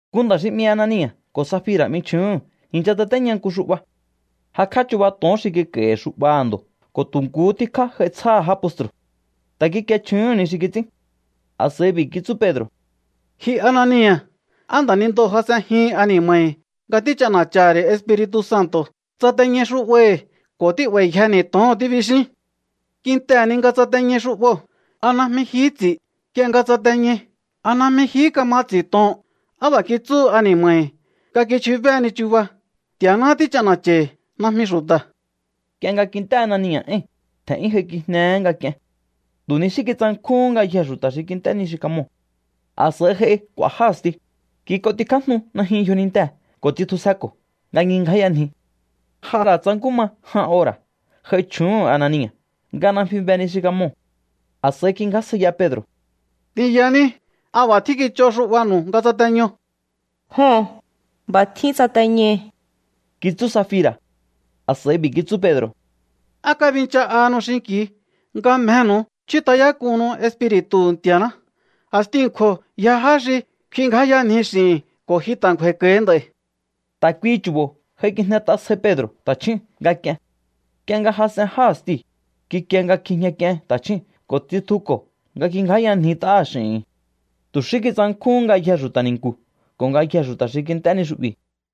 Nku nda̱ xi 'mi Anania̱ ko̱ Safira̱ 'mi chju̱úhu̱n i̱ncha tsatéña nku xu'ba. Jakj'á chuba to̱on xi kik'a̱i̱hi̱ xu'baha̱ ndo̱ ko̱ tu̱ nkuhú tíkjá j'ai tsjáha̱ já postru̱. Ta̱ kikie chju̱úhu̱n ni xi kits'ín. A̱s'a̱i b'i̱ kitsú Pedro̱: —Ji Anania̱, ¿á nda̱nindoo̱ jas'enjihin ani̱ma̱hi̱ nga tích'ana̱cha̱ha̱ ri̱ Espiri̱tu̱ Santo̱? Tsateñai xu'bahi̱ ko̱ tí'ba̱i̱yjeni̱ to̱oo̱n tíbixín. Kintehe̱ ni nga tsateñai xu'boo̱, ¿a najmi jihí ts'i̱? Nk'ie nga tsateñai, ¿a najmi jihí ka̱ma ts'i̱hi to̱oo̱n? ¿Á b'a̱ kitsúhu ani̱ma̱hi̱ nga kichjubéheni chuba? Nti̱a̱ná tích'ana̱cha̱i̱hi̱, najmi xu̱ta̱. Nk'ie nga kint'é Anania̱ éi̱n, tje̱n'yún j'aikijnehé nga k'ien. Tu̱ ni xí kitsankjúhún ngayjee̱ xu̱ta̱ xi kint'é ni xi kamoo̱. A̱s'a̱i j'ai k'u̱a̱ já a̱sti, kik'otikjájnu najyun yjonintee̱ ko̱ tsitjusjeko̱ nga ngjingjáyanji. J'a ra̱ tsa nkú ma jan ora̱ j'ai chju̱úhu̱n Anania̱ nga najmi be ni xi kamoo̱. A̱s'a̱i kingjásjaiya Pedro̱: —T'inyaní, ¿a b'a̱ tjín kich'o xu'banu̱u nga tsateño? —Joho̱n, b'a̱ tjín tsateñai̱ —kitsú Safira̱. A̱s'a̱i b'i̱ kitsú Pedro̱: —¿Á kabincha'ahanu xinki̱u nga mjehe̱nu̱u chjút'ayák'uhunnu Espiri̱tu̱hu̱ Nti̱a̱ná? A̱stiu̱ a̱nkju̱o̱ yja já xi kfingjáyanji x'i̱hi̱n ko̱ ji ta̱ ngju̱a̱i̱ko̱hi nd'a̱i̱. Ta̱ kuihi chu̱bo̱ j'aikijnet'a sjai Pedro̱ ta̱chjúu̱n nga k'ien. Nk'ie nga jas'en já a̱stiu̱, kikie nga kjijña k'ien ta̱chjúu̱n ko̱ tsitjuko̱ nga ngjingjáyanjit'aha̱ x'i̱hi̱n. Tu̱ xí kitsankjúhún ngayjee̱ xu̱ta̱ ni̱nku̱ ko̱ ngayjee̱ xu̱ta̱ xi kint'é ni xu'bi̱.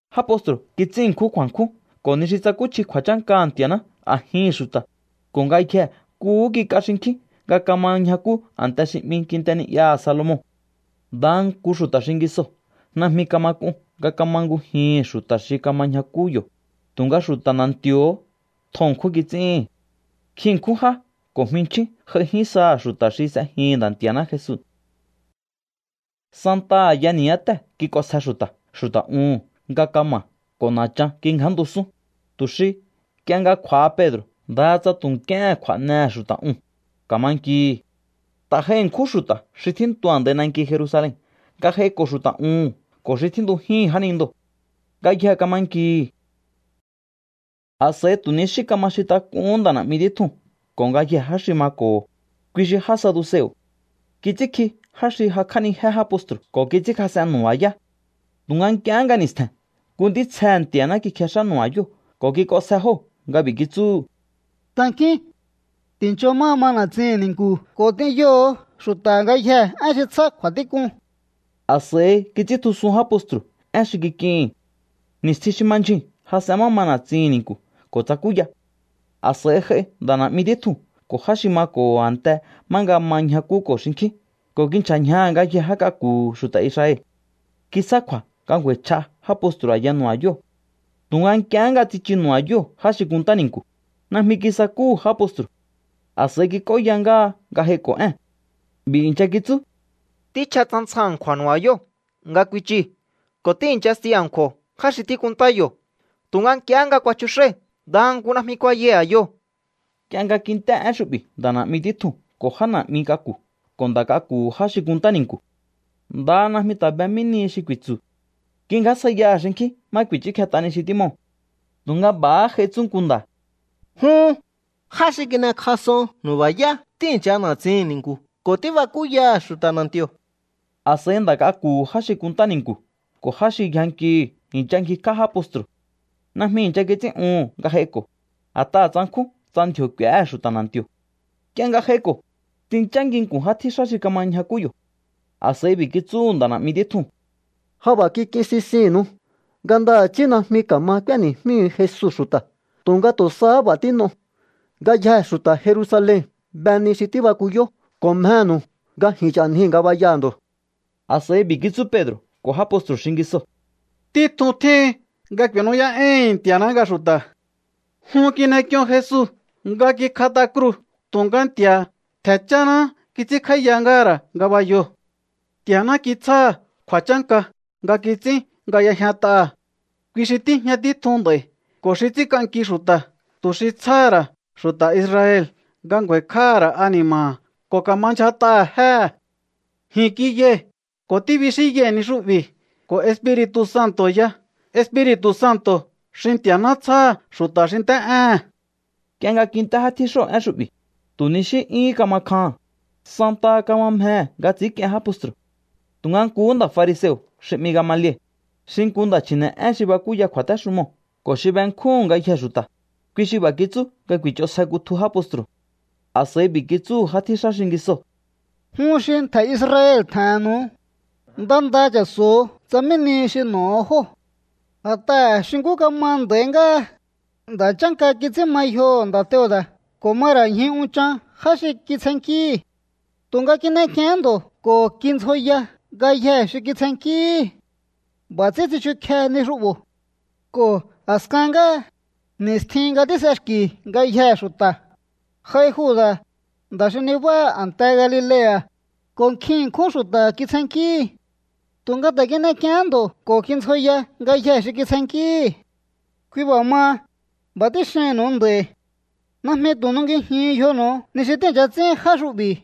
Já postru̱ kits'ín ṉkjún kju̱a̱nkjún ko̱ ni xi tsakúchji kju̱a̱chánkaha̱ Nti̱a̱ná a̱jihi̱n xu̱ta̱, ko̱ ngayjee̱ nkuhú kik'a xinkjín nga kama ñjakú a̱nte xi 'mi Kinte Ni'yaha̱ Salomon. Ndaha nku xu̱ta̱ xingisoo̱ najmi kama k'un nga ka̱ma ngujihi̱n xu̱ta̱ xi kama ñjakú yo̱, tu̱nga xu̱ta̱ na̱nti̱o̱hó tjo ṉkjún kits'íhi̱n. Nkjin ṉkjún já ko̱ jminchjín j'aijín saha̱ xu̱ta̱ xi s'ejihi̱n Nda̱ Nti̱a̱ná Jesu. Santaha a̱ya ni̱yátée̱ kik'onsje xu̱ta̱ xu̱ta̱ uhu̱n nga kama̱ ko̱ na̱chan kingjántusún, tu̱ xi nk'ie nga kj'u̱a̱ha Pedro̱ ndaha tsa tu̱ nk'íéhe̱n kj'u̱a̱nehe̱ xu̱ta̱ uu̱n, ka̱ma nkihi̱. Ta̱ j'ai ṉkjún xu̱ta̱ xi tjíntu a̱ndai nanki Jerusalen nga j'aiko̱ xu̱ta̱ uhu̱n ko̱ xi tjíntujíhi̱n jánindoo̱. Ngayjee̱ kama nkihi̱. A̱s'a̱i tu̱ ni xí kama xintak'uhún nda̱ na̱'mi títjuu̱n ko̱ ngayjee̱ já xi mako̱ho̱, kui xi já saduseo̱. Kits'ínkji já xi jakj'ánijé já postru̱ ko̱ kits'ínkjas'en nu̱ba̱yá. Tu̱nga nk'iehé nga ni̱stje̱n nku ntítsjehe̱ Nti̱a̱ná kikjex'á nu̱ba̱yóo̱ ko̱ kik'onsje jóo̱ nga b'i̱ kitsúhu̱: —Tankíún. Ti̱ncho má ma na̱tsihi̱n ni̱nku̱ ko̱ t'inyoho̱o xu̱ta̱ ngayjee̱ én xi tsjá kju̱a̱tík'un. A̱s'a̱i kits'íntjusun já postru̱ én xi kik'ihi̱n. Ni̱stjin xi ma ndyjuu̱n jas'en má ma na̱tsihi̱n ni̱nku̱ ko̱ tsakúya. A̱s'a̱i j'ai nda̱ na̱'mi títjuu̱n ko̱ já xi mako̱ho̱ a̱nte má nga ma ñjakúko̱ xinkjín ko̱ kinchja̱ ñjaha̱ ngayjee̱ já k'aku̱hu̱ xu̱ta̱ Israel. Kitsjá kju̱a̱ nga ngju̱a̱i̱chj'a já postru̱ a̱ya nu̱ba̱yóo̱. Tu̱nga nk'iehé nga tsichu nu̱ba̱yóo̱ já xi kunntá ni̱nku̱, najmi kisakúhu̱ já postru̱. A̱s'a̱i kik'óya ngáha nga j'aiko̱ én. B'i̱ i̱ncha kitsú: —Tjíchja tsjan tsjan a̱nkju̱a̱ nu̱ba̱yóo̱ nga kuichii̱ ko̱ tíi̱nchasti a̱nkju̱o̱ já xi tíkunntá yo̱. Tu̱nga nk'iehé nga kuachjux'ái̱, ndaha nku najmi kuayai̱ a̱yoo̱. Nk'ie nga kint'é én xu'bi̱ nda̱ na̱'mi títjuu̱n ko̱ já na̱'mi k'aku̱ ko̱ nda̱ k'aku̱hu̱ já xi kunntá ni̱nku̱, ndaha najmi ta̱ be mí ni xi ku̱i̱tsu̱. Kingjásjaiyaha̱ xinkjín má ku̱i̱chúkjet'a ni xi tímoo̱. Tu̱nga b'a̱há j'ai tsú nku nda̱: —Jun, já xi kin'ekjas'on nu̱ba̱yá tíi̱ncha na̱tsihi̱n ni̱nku̱ ko̱ tíbakúyaha̱ xu̱ta̱ na̱nti̱o̱. A̱s'a̱i nda̱ k'aku̱hu̱ já xi kunntá ni̱nku̱ ko̱ já xi yjankihi̱ i̱ncha ngjikj'á já postru̱. Najmi i̱ncha kits'ín'uhu̱n nga j'aiko̱, a̱t'aha̱ tsankjún tsa ndji̱o̱ k'u̱éhe̱ xu̱ta̱ na̱nti̱o̱. Nk'ie nga j'aiko̱, tsinchá nginku̱n já tjíxá xi kama ñjakú yo̱. A̱s'a̱i b'i̱ kitsúhu̱ nda̱ na̱'mi títjuu̱n: —Ja b'a̱ kik'in sisinnu̱u nga ndaha̱chí najmi ka̱ma k'úéni̱jmíhu̱u Jesu xu̱ta̱, tu̱nga tu̱ sahá b'a̱ tín'o. Ngayjee̱ xu̱ta̱ Jerusalen be ni xi tíbakuyó, ko̱ mjenu̱u nga ji̱n ch'a̱njii̱ ngabayaha̱ ndo̱. A̱s'a̱i b'i̱ kitsú Pedro̱ ko̱ já postru̱ xingisoo̱: —Títjun tjíhin nga ku̱i̱nú'yá'éi̱hi̱n Nti̱a̱ná nga xu̱ta̱. Jun kin'ek'ion Jesu nga kikjat'a kruu̱, tu̱nga Nti̱a̱ha̱ ntje̱ cháháná kits'ínkj'áíya ngáha̱ ra̱ ngabayoo̱. Nti̱a̱ná kitsjáha̱ kju̱a̱chánka nga kits'ín nga y'ejñat'aha̱. Kui xi tíjña títjun nd'a̱i̱ ko̱ xi ts'ínk'anki xu̱ta̱, tu̱ xi tsjáha̱ ra̱ xu̱ta̱ Israel nga ngju̱a̱i̱kj'áha̱ ra̱ ani̱ma̱ha̱ ko̱ ka̱ma ndyjat'aha̱ jéhe̱. Ji̱n kiyai̱ ko̱ tíbixínyai̱ ni xu'bi̱ ko̱ Espiri̱tu̱ Santo̱ ya, Espiri̱tu̱ Santo̱ xi Nti̱a̱ná tsjáha̱ xu̱ta̱ xi nt'é'éhe̱n. Nk'ie nga kint'é já tjíxóo̱ én xu'bi̱, tu̱ ni xí 'yúhún kama kjaha̱n, santaha kama mjehe̱ nga ts'i̱ínk'ien já postru̱. Tu̱nga nkuhú nda̱ fariseo̱ xi 'mi Gamaliel, xi nku nda̱ chji̱ne̱'én xi bakúya kju̱a̱téxumoo̱ ko̱ xi benkjúhu̱n ngayjee̱ xu̱ta̱, kui xi b'a̱ kitsú nga ku̱i̱ch'onsje kutju já postru̱. A̱s'a̱i b'i̱ kitsúhu̱ já tjíxá xingisoo̱: —Jun xi ntje̱ Israel tje̱he̱nnu̱u, nda nda cha̱so̱o tsa mí nihi xi n'o̱ho̱ jóo̱. A̱t'aha̱ xi nkú kama nd'a̱i ngáha, nda̱ chánka kits'ín ma yjoho̱ nda̱ Teuda̱ ko̱ ma ra̱ ñju unchan já xi kitsjennkíhi̱. Tu̱nga kin'ek'iehén ndo̱ ko̱ kindzjoya ngayjee̱ xi kitsjennkíhi̱. B'a̱ ts'ín tsichukjehe ni xu'bo̱. Ko̱ a̱skan ngáha, ni̱stjin nga tís'exki̱ ngayjee̱ xu̱ta̱, j'ai Juda̱, nda̱ xi nibáha a̱nte Galilea̱, ko̱ nkjin ṉkjún xu̱ta̱ kitsjennkíhi̱. Tu̱nga ta̱ kin'ek'iehén ndo̱ ko̱ kindzjoya ngayjee̱ xi kitsjennkíhi̱. ’Kui b'a̱ maha, b'a̱ tíxihi̱nnu̱u nd'a̱i̱. Najmi tu̱ nungijiun yjonu̱u ni xi tíi̱ncha ts'ín já xu'bi̱.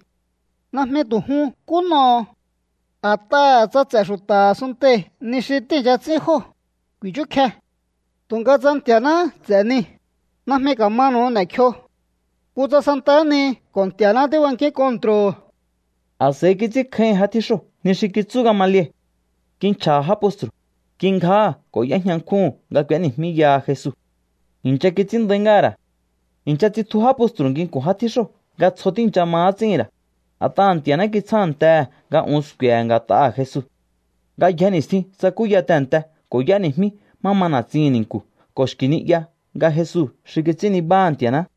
Najmi tu̱ jun nkú n'oho̱o. A̱t'aha̱ tsa ts'e̱ xu̱ta̱ a̱sunntei̱ ni xi tíi̱ncha ts'ín jóo̱, ku̱i̱chúkje. Tu̱nga tsa Nti̱a̱náhá ts'e̱ niu̱, najmi ka̱manu̱u n'e̱kjio. Kutsa santahá ni ko̱ Nti̱a̱ná tíbankíún kontro̱o. A̱s'a̱i kits'ínkjáíhi̱n já tjíxóo̱ ni xi kitsú Gamaliel. Kinchja̱ha̱ já postru̱, kingjáha̱ ko̱ y'éjña nkjúhu̱n nga k'u̱éni̱jmíyaha Jesu. I̱ncha kits'ín nda̱í ngáha̱ ra̱. I̱ncha tsitju já postru̱ nginku̱n já tjíxóo̱ nga tsjo tíi̱ncha ma ts'íhi̱n ra̱, a̱t'aha̱ Nti̱a̱ná kitsjántehe̱ nga un sku̱e̱he̱ nga̱t'aha̱ Jesu. Ngayje ni̱stjin tsakúya tehe̱nte ko̱ y'éni̱jmí má ma na̱tsihi̱n ni̱nku̱ ko̱ xki̱ ni'ya nga Jesu xi kits'ín nibá Nti̱a̱ná.